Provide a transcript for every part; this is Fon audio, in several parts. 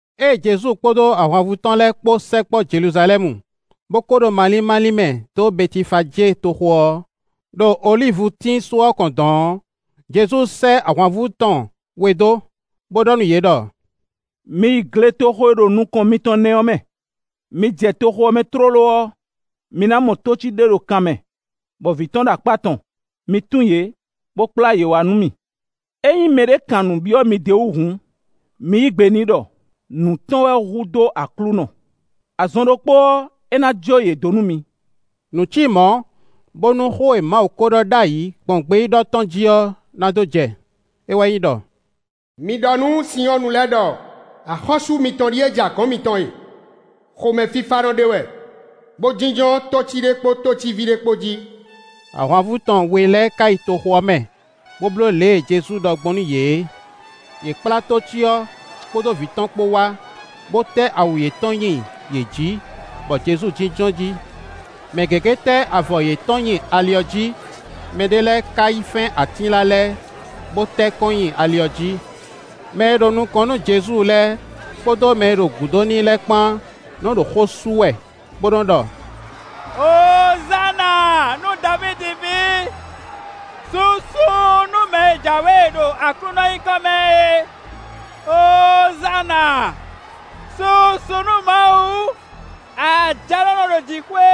Ée Jezu kpódó ahwanvú tɔn lɛ́ɛ kpó sɛkpɔ́ Jeluzalɛ́mu, bó ko ɖo malín málín mɛ dó Bɛtifajée toxo ɔ́, ɖo olívutín só ɔ́ kɔn dɔ̌n ɔ́, Jezu sɛ́ ahwanvú tɔn we dó; bó ɖɔ nú yě ɖɔ: “Mi yi gletoxo e ɖo nukɔn mitɔn nɛ́ ɔ́ mɛ; mi jɛ toxo ɔ́ mɛ tlóló ɔ́, mi ná mɔ tócí ɖé ɖo kan mɛ, bɔ vǐ tɔn ɖo akpá tɔn, mi tún yě, bó kplá yě wá nú mì. Ényí mɛɖé kan nǔ byɔ́ mi d'é wú hǔn, mi yí gbe n'i ɖɔ: ‘Nǔ tɔn wɛ hu dó Aklúnɔ.’ Azɔn ɖokpó ɔ́, é ná jó yě dó nú mi.” Nǔ cí mɔ̌, bónú xó e Mawu ko ɖɔ ɖ'ayǐ gbɔn gbeyíɖɔ tɔn jí ɔ́ ná dó jɛ; é wɛ nyí ɖɔ: “Mi ɖɔ nú Sinyɔ́ɔnu lɛ́ɛ ɖɔ: axɔ́sú mitɔn ɖíe ja gɔ̌n mitɔn e; xomɛfífánɔ ɖé wɛ; bo jínjɔ́n tócí ɖé kpó tócíví ɖé kpó jí.” Ahwanvú tɔn we lɛ́ɛ ka yi toxo ɔ́ mɛ, bo bló lě e Jezu ɖɔ gbɔn nú yě é. Yě kplá tócí ɔ́ kpódó vǐ tɔn kpó wá, bó tɛ́ awu yětɔn nyi yě jǐ, bɔ Jezu jínjɔ́n jí. Mɛ gěgé tɛ́ avɔ yětɔn nyi ali ɔ́ jí, mɛɖé lɛ́ɛ ka yi fɛ́n atínla lɛ́ɛ, bó tɛ́ kɔn nyi ali ɔ́ jí. Mɛ e ɖo nukɔn nú Jezu lɛ́ɛ kpódó mɛ e ɖo gǔdo n'i lɛ́ɛ kpán nɔ́ ɖo xó sú wɛ, bó nɔ́ ɖɔ: “Ozána nú Davídi ví! Susu nú mɛ e jǎwe ɖo Aklúnɔ nyǐkɔ mɛ é! Ozána! Susu nú Mawu Ajalɔ̌nlɔn ɖo jǐxwé!”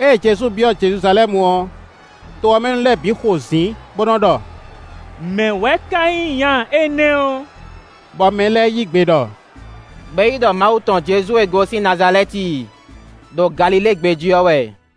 Ée Jezu byɔ́ Jeluzalɛ́mu ɔ́, to ɔ́ mɛ nu lɛ́ɛ bǐ xozǐn, bó nɔ́ ɖɔ: “Mɛ̌ wɛ ka nyí nya énɛ́ ɔ́?” Bɔ mɛ lɛ́ɛ yí gbe ɖɔ: “Gbeyíɖɔ Mawu tɔn Jezu e gosín Nazalɛ́ti, ɖo Galilée gbé jí ɔ́ wɛ.”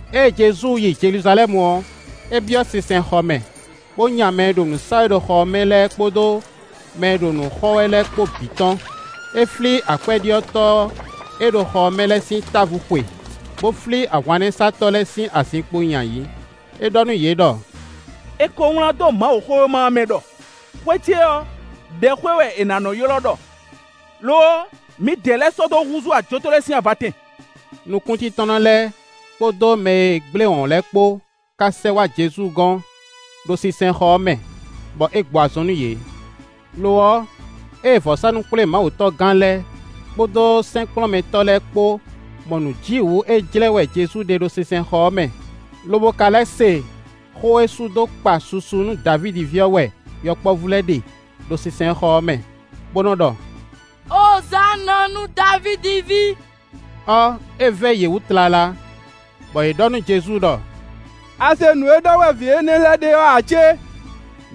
Ée Jezu yi Jeluzalɛ́mu ɔ́, é byɔ́ sinsɛnxɔ mɛ, bó nya mɛ e ɖo nǔ sa wɛ ɖo xɔ ɔ́ mɛ lɛ́ɛ kpódó mɛ e ɖo nǔ xɔ wɛ lɛ́ɛ kpó bǐ tɔ́n; é flí akwɛ́ɖyɔ́tɔ́ e ɖo xɔ ɔ́ mɛ lɛ́ɛ sín távo xwe, bó flí ahwannɛ́satɔ́ lɛ́ɛ sín azinkpo nyi ayǐ. É ɖɔ nú yě ɖɔ: “È ko wlán dó Mawuxówéma ɔ́ mɛ ɖɔ: ‘Xwé ce ɔ́, ɖɛxwé wɛ è nǎ nɔ́ ylɔ́ ɖɔ.’ Lo ɔ́, midɛɛ lɛ́ɛ sɔ́ dó húzú ajotɔ́ lɛ́ɛ sín avatɛn.” Nukúntíntɔ́nnɔ lɛ́ɛ kpódó mɛ e gblé wɔ̌n lɛ́ɛ kpó ka sɛ wá Jezu gɔ́n, ɖo sinsɛnxɔ ɔ́ mɛ, bɔ é gbɔ azɔn nú yě. Lo ɔ́, ée vɔ̌sánú-xwlémawutɔ́gán lɛ́ɛ kpódó sɛ́nkplɔ́nmɛtɔ́ lɛ́ɛ kpó mɔ nǔjíwǔ e jlɛ́ wɛ Jezu ɖe ɖo sinsɛnxɔ ɔ́ mɛ, lobo ka lɛ́ se xó e sú dó kpa susu nú Davídi ví ɔ́ wɛ yɔkpɔ́vú lɛ́ɛ ɖe ɖo sinsɛnxɔ ɔ́ mɛ, bó nɔ́ ɖɔ: “Ozána nú Davídi ví” ɔ́, é vɛ́ yě wú tlala; bɔ yě ɖɔ nú Jezu ɖɔ: “A se nǔ e ɖɔ wɛ vǐ énɛ́ lɛ́ɛ ɖe ɔ́ ǎ cé?”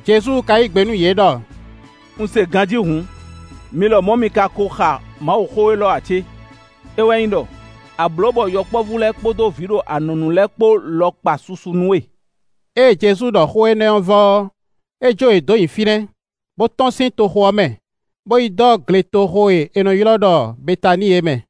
Jezu ka yí gbe nú yě ɖɔ: “Un se ganjí hǔn. Mi lɔmɔ̌ mi ka ko xa Mawuxó élɔ́ ǎ cé? É wɛ nyí ɖɔ: ‘A blǒ bɔ yɔkpɔ́vú lɛ́ɛ kpódó vǐ ɖo anɔ̌nu lɛ́ɛ kpó lɔ kpa susu nú we.’” Ée Jezu ɖɔ xó énɛ́ ɔ́ vɔ ɔ́, é jó yě dó nyi fínɛ́, bó tɔ́n sín toxo ɔ́ mɛ, bó yi dɔ́ gletoxo e è nɔ ylɔ́ ɖɔ Betaníi é mɛ.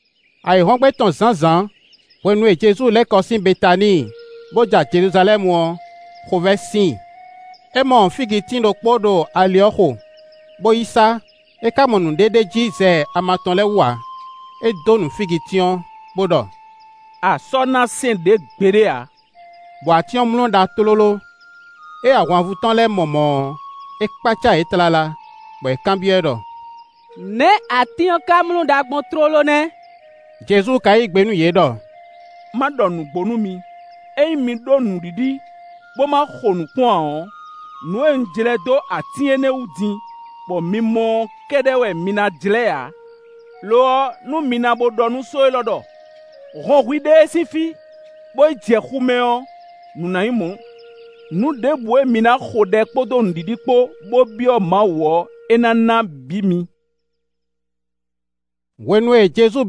Ayǐhɔ́ngbe tɔn zǎnzǎn, hwenu e Jezu lɛ́ kɔ sín Betaníi, bó ja Jeluzalɛ́mu ɔ́, xovɛ́ sin i. É mɔ fígitín ɖokpó ɖo ali ɔ́ xo, bó yi sá, é ka mɔ nǔɖé ɖ'é jí zɛ ama tɔn lɛ́ɛ wú ǎ; é dó nu fígitín ɔ́, bó ɖɔ: “A sɔ́ ná sɛ́n ɖě gbeɖé ǎ,” bɔ atín ɔ́ mlú ɖa tlóló. Ée ahwanvú tɔn lɛ́ɛ mɔ mɔ̌ ɔ́, é kpácá yě tlala, bɔ yě kanbyɔ́ ɛ ɖɔ: “Nɛ̌ atín ɔ́ ka mlú ɖa gbɔn tlóló nɛ́?” Jezu ka yí gbe nú yě ɖɔ: “Má ɖɔ nǔgbó nú mi: ényí mi ɖó nǔɖiɖi, bó má nɔ́ xo nǔ kpɔ́n ǎ ɔ́, nǔ e un jlɛ́ dó atín énɛ́ wú din, bɔ mi mɔ ɔ́ kɛ́ɖɛ́ wɛ mi ná jlɛ́ ǎ; lo ɔ́, nú mi na bo ɖɔ nú só élɔ́ ɖɔ: ‘Hɔn hwiɖée sín fí, bó yi jɛ xu mɛ’ ɔ́, nǔ ná nyí mɔ̌. Nǔ ɖěbǔ e mi na xo ɖɛ kpódó nǔɖiɖi kpó, bó byɔ́ Mawu ɔ́, é ná ná bǐ mi.” Mɛ̌ wɛ ná acɛ Jezu?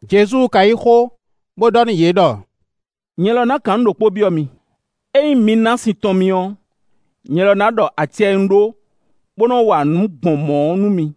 Jezu ka yí xó, bó ɖɔ nú yě ɖɔ: “Nyɛ lɔ ná kan nǔ ɖokpó byɔ́ mi. Ényí mi ná sin tɔn mì ɔ́, nyɛ lɔ ná ɖɔ acɛ e un ɖó, bó nɔ́ wa nǔ gbɔn mɔ̌ ɔ́ nú mi.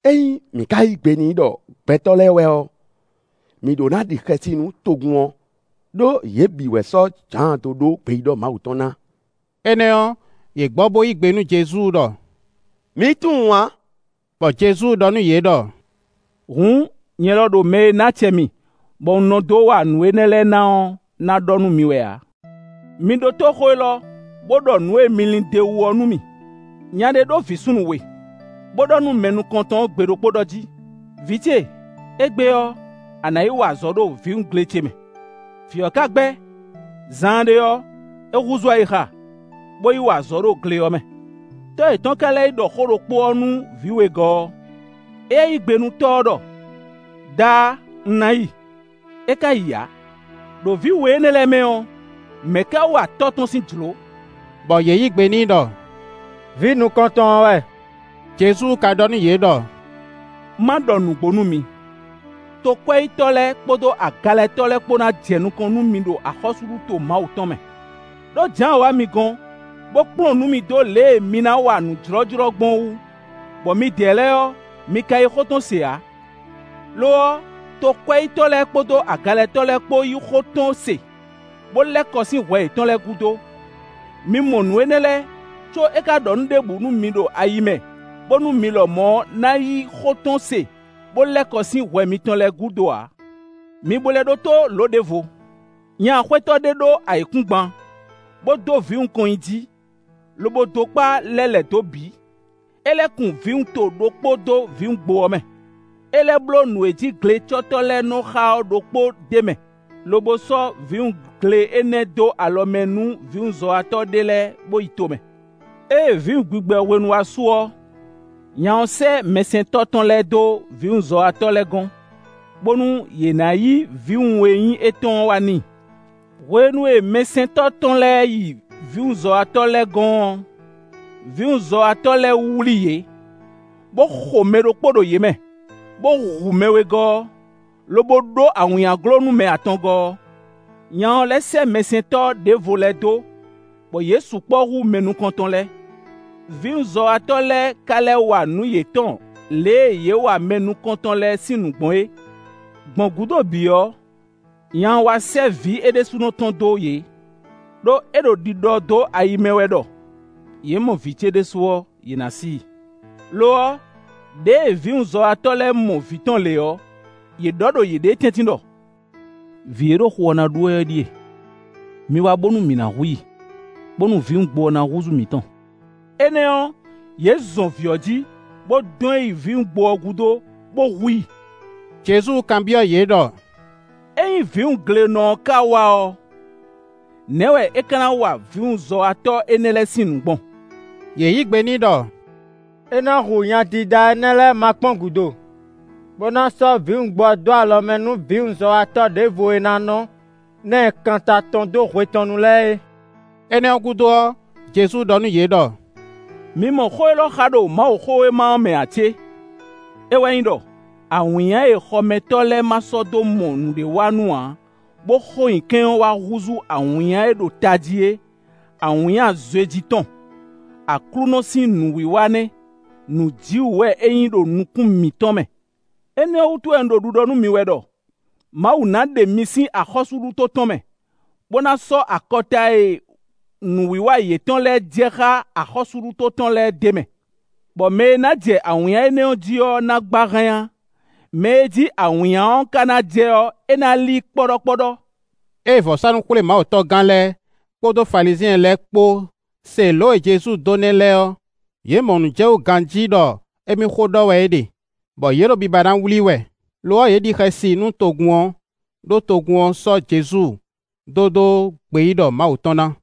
Ényí mǐ ka yí gbe n'i ɖɔ gbɛtɔ́ lɛ́ɛ wɛ ɔ́, mǐ ɖó ná ɖi xɛsi nú togun ɔ́; ɖó yě bǐ wɛ sɔ́ Jǎan dó ɖó gbeyíɖɔ Mawu tɔn ná.” Énɛ́ ɔ́, yě gbɔ bó yí gbe nú Jezu ɖɔ: “Mǐ tunwun ǎ.” Bɔ Jezu ɖɔ nú yě ɖɔ: “Hǔn nyɛ lɔ ɖo mɛ e ná acɛ mì, bɔ un nɔ dó wa nǔ énɛ́ lɛ́ɛ ná ɔ́ ná ɖɔ nú mi wɛ ǎ.” “Mi ɖótó xó élɔ́, bó ɖɔ nǔ e mi lin d'é wú ɔ́ nú mì: nya ɖé ɖó vǐ súnnu we, bó ɖɔ nú mɛ nukɔntɔn ɔ́ gbe ɖokpó ɖɔ jí: ‘Vǐ ce, égbé ɔ́, a na yi wa azɔ̌ ɖo vǐwungle ce mɛ.’ Vǐ ɔ́ ka gbɛ́; zaanɖé ɔ́, é húzú ayixa bó yi wa azɔ̌ ɖo gle ɔ́ mɛ. Tɔ́ yětɔn ka lɛ́ yi ɖɔ xó ɖokpó ɔ́ nú vǐ wegɔ́ ɔ́. Éyɛ́ yí gbe nú tɔ́ ɔ́ ɖɔ: ‘Daá, un ná yi;’ é ka yi ǎ. Ɖo vǐ we énɛ́ lɛ́ɛ mɛ ɔ́, mɛ̌ ka wa tɔ́ tɔn sín jlǒ?” Bɔ yě yí gbe n'i ɖɔ: “Vǐ nukɔntɔn ɔ́ wɛ.” Jezu ka ɖɔ nú yě ɖɔ: “Má ɖɔ nǔgbó nú mi: tokwɛ́yítɔ́ lɛ́ɛ kpódó agalɛtɔ́ lɛ́ɛ kpó ná jɛ nukɔn nú mi ɖo axɔ́súɖuto Mawu tɔn mɛ. Ɖó Jǎan wá mi gɔ́n, bó kplɔ́n nǔ mi dó lě e mi ná wa nǔ jlɔ́jlɔ́ gbɔn ɔ́ wú, bɔ midɛɛ lɛ́ɛ ɔ́, mi ka yí xó tɔn se ǎ. Lo ɔ́, tokwɛ́yítɔ́ lɛ́ɛ kpódó agalɛtɔ́ lɛ́ɛ kpó yí xó tɔn se, bó lɛ́ kɔ sín hwɛ yětɔn lɛ́ɛ gúdo. Mi mɔ nǔ énɛ́ lɛ́ɛ, có é ka ɖɔ nǔ ɖěbǔ nú mi ɖo ayi mɛ, bónú mi lɔmɔ̌ ná yí xó tɔn se, bó lɛ́ kɔ sín hwɛ mitɔn lɛ́ɛ gúdo ǎ.” “Mi bo lɛ́ ɖótó lǒ ɖěvo: Nya xwétɔ́ ɖé ɖó ayǐkúngban, bó dó vǐwun kɔn nyi jí, lobo dó kpá lɛ́ lɛ̌ dó bǐ; é lɛ́ kun vǐwunto ɖokpó dó vǐwungbo ɔ́ mɛ. É lɛ́ bló nǔ e jí glecɔ́tɔ́ lɛ́ɛ nɔ́ xá ɔ́ ɖokpó d'é mɛ, lobo sɔ́ vǐwungle énɛ́ dó alɔ mɛ nú vǐwunzɔ́watɔ́ ɖé lɛ́ɛ, bó yi tomɛ. Ée vǐwun gbigbɛ hwenu wá su ɔ́, nya ɔ́ sɛ́ mɛsɛntɔ́ tɔn lɛ́ɛ dó vǐwunzɔ́watɔ́ lɛ́ɛ gɔ́n, bónú yě ná yí vǐwun e nyí étɔn ɔ́ wá n'i. Hwenu e mɛsɛntɔ́ tɔn lɛ́ɛ yi vǐwunzɔ́watɔ́ lɛ́ɛ gɔ́n ɔ́, vǐwunzɔ́watɔ́ lɛ́ɛ wlí yě, bó xo mɛ ɖokpó ɖo yě mɛ, bó hu mɛ wegɔ́ ɔ́, lobo ɖó awǐnnyaglo nú mɛ atɔngɔ́ ɔ́. Nya ɔ́ lɛ́ sɛ́ mɛsɛntɔ́ ɖěvo lɛ́ɛ dó, bɔ yě sukpɔ́ hú mɛ nukɔntɔn lɛ́ɛ. Vǐwunzɔ́watɔ́ lɛ́ɛ ka lɛ́ wa nǔ yětɔn lě e yě wa mɛ nukɔntɔn lɛ́ɛ sín nǔ gbɔn é. Gbɔn gǔdo bǐ ɔ́, nya ɔ́ wá sɛ́ vǐ é ɖésúnɔ tɔn dó yě, ɖó é ɖo ɖiɖɔ dó ayi mɛ wɛ ɖɔ: ‘Yě mɔ vǐ ce ɖésú ɔ́, yě ná sí i.’ Lo ɔ́, ɖěe vǐwunzɔ́watɔ́ lɛ́ɛ mɔ vǐ tɔn lě ɔ́, yě ɖɔ ɖo yěɖée tɛ́ntin ɖɔ: ‘Vǐ e ɖo xu ɔ́ ná ɖu wɛ é ɖíe; mi wá bónú mǐ ná hu i, bónú vǐwungbo ɔ́ ná húzú mǐtɔn.’ Énɛ́ ɔ́, yě zɔn vǐ ɔ́ jí, bó dɔn ɛ yi vǐwungbo ɔ́ gúdo, bó hu i.” Jezu kanbyɔ́ yě ɖɔ: “Ényí vǐwunglenɔ ɔ́ ka wá ɔ́, nɛ̌ wɛ é ka ná wa vǐwunzɔ́watɔ́ énɛ́ lɛ́ɛ sín nǔ gbɔn?” Yě yí gbe n'i ɖɔ: “É ná hu nya dídá énɛ́ lɛ́ɛ ma kpɔ́n gǔdo, bó ná sɔ́ vǐwungbo ɔ́ dó alɔ mɛ nú vǐwunzɔ́watɔ́ ɖěvo e ná nɔ ná ɛ kanta tɔn dó hwetɔnnu lɛ́ɛ é.” Énɛ́ ɔ́ gúdo ɔ́, Jezu ɖɔ nú yě ɖɔ: “Mi mɔ xó élɔ́ xa ɖo Mawuxówéma ɔ́ mɛ ǎ cé? É wɛ nyí ɖɔ: ‘Awǐnnya e xɔmɛtɔ́ lɛ́ɛ ma sɔ́ dó mɔ nǔɖéwanú ǎ, bó xo nyi kɛ́n ɔ́ wá húzú awǐnnya e ɖo tají é, awǐnnya zwe jí tɔn; Aklúnɔ sín nǔwiwa nɛ́, nǔjíwǔ wɛ é nyí ɖo nukún mǐtɔn mɛ.’ Énɛ́ ɔ́ wútu wɛ un ɖo ɖiɖɔ nú mi wɛ ɖɔ: ‘Mawu ná ɖe mi sín axɔ́súɖuto tɔn mɛ, bó ná sɔ́ akɔta e nǔwiwa yětɔn lɛ́ɛ jɛ xá axɔ́súɖuto tɔn lɛ́ɛ d'é mɛ, [ bɔ mɛ e ná jɛ awǐnnya énɛ́ ɔ́ jí ɔ́ ná gba hánnyá; mɛ e jí awǐnnya ɔ́ ka ná jɛ ɔ́, é ná li i kpɔ́ɖɔ́kpɔ́ɖɔ́.]’” Ée vɔ̌sánú-xwlémawutɔ́gán lɛ́ɛ kpódó Falizyɛn lɛ́ɛ kpó se lǒ e Jezu dó nɛ́ lɛ́ɛ ɔ́, yě mɔ nǔ jɛ wú ganjí ɖɔ émí xó ɖɔ wɛ é ɖe, bɔ yě ɖo biba ná wlí i wɛ; lo ɔ́, yě ɖi xɛsi nú togun ɔ́, ɖó togun ɔ́ sɔ́ Jezu dó ɖó gbeyíɖɔ Mawu tɔn ná.